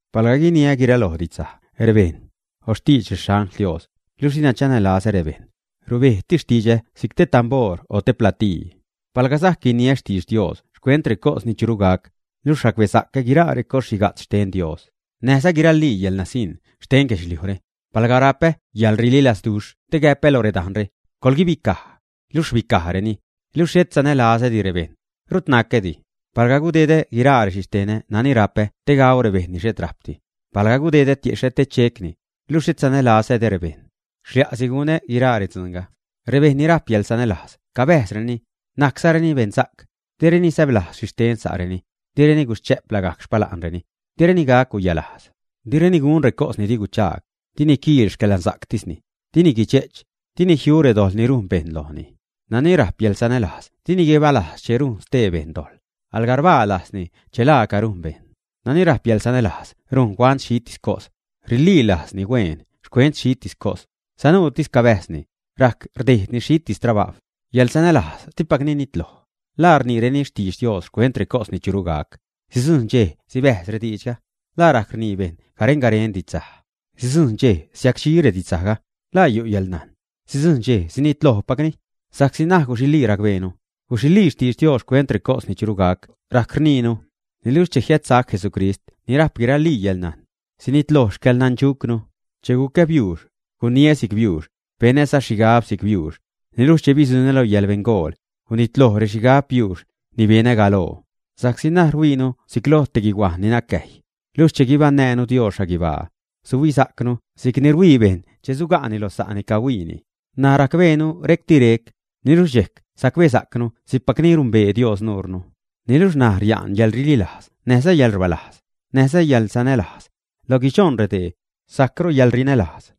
Palga guiniä guiraloj xtidxsaj rebejṉ, o xtidx rexangl Dios, luxh dina chanälazä rebejṉ, rubejtis xtidxä si'c te tamboor o te platii. Palga sajc guiniä xtidx Dios xcuent recos ni churu gac, luxh racbesa'cä guiraa recos xhiga'tz xten Dios, näjza guiralii yäḻnasiṉ xten guedxliujre, palga rapä yäḻrililazduxh te gac gäpä lo redajnre, “coḻguibicaj”, luxh rbicajreni, niluxh xhet sanälazädi rebejṉ, rut nacädi. Palga gudedä guiraa rexhixtenä nani rapä te gau rebejṉ ni xhet rajpdi; palga gudedä tiexhä te checni, luxh xhet sanälazädi rebejṉ, xlia'si gunä guiraa redzuunga. Rebejṉ ni rajp yäḻsanälajz cabäjzreni, najczareni beṉsa'c, direni säblajz xhi xten sa'reni, direni guschä'p lagajc xpala'nreni, direni gac guyalajz. Direni gun recos ni di guchaag, dini quiil xcäḻnasa'ctisni, dini guidxe'ch, dini jiu redojḻ ni rujn bejṉ lojni. Nani rajp yäḻsanälajz dini guibalajz che rujn stee bejṉ dojḻ, alga rbaa lajzni che laaca rujn bejṉ. Nani rajp yäḻsanälajz rujn huant xhitis cos, rililajzni hueen xcuent xhitis cos, sanuutis cabäjzni, rajc rdejdni xhitis trabajw. Yäḻsanälajz dipacni nitloj. ¿La rniireni xtidx Dios xcuent recos ni churu gac, ä? Sidzujn dxej sibäjz rediidxga. ¿La rajc rnii bejṉ garen-garen redidxsaj, ä? Sidzujṉ dxej siacdxi redidxsajga. ¿La yu' yäḻnajn? Sidzujṉ dxej sinitlojpacni. Sa'csi ṉaj guxilii racbeenu, guxilii xtidx Dios xcuent recos ni churu gac rajc rniinu, niluxh che jiädsac Jesucrist ni rajp guiralii yäḻnajn, sinitloj xcäḻnandxucnu. Che gucä biuux, guniä si'c biuux, benäza xhigab si'c biuux, niluxh che bidzuṉä lo yäḻbeṉgol, gunitloj rexhigab biuux ni benä galoo. Sa'csi ṉaj rhuiinu si'c loj te guihuajn ni nacäjy, luxh che guibaṉnäänu Dios xhaguibaa, suhuisa'cnu si'cni ruhuii bejṉ che suga'ni loj sa'ni cahuiinini. N̲aj racbeenu re'cti rec, niluxh dxejc sacbesa'cnu si'cpacni numbee Dios nuure. Niluxh ṉaj ria'n yäḻrililajz näjza yäḻrbäzlajz, näjza yäḻsanälajz. Lo guidxoṉ redee, sajcru yäḻrinälajz.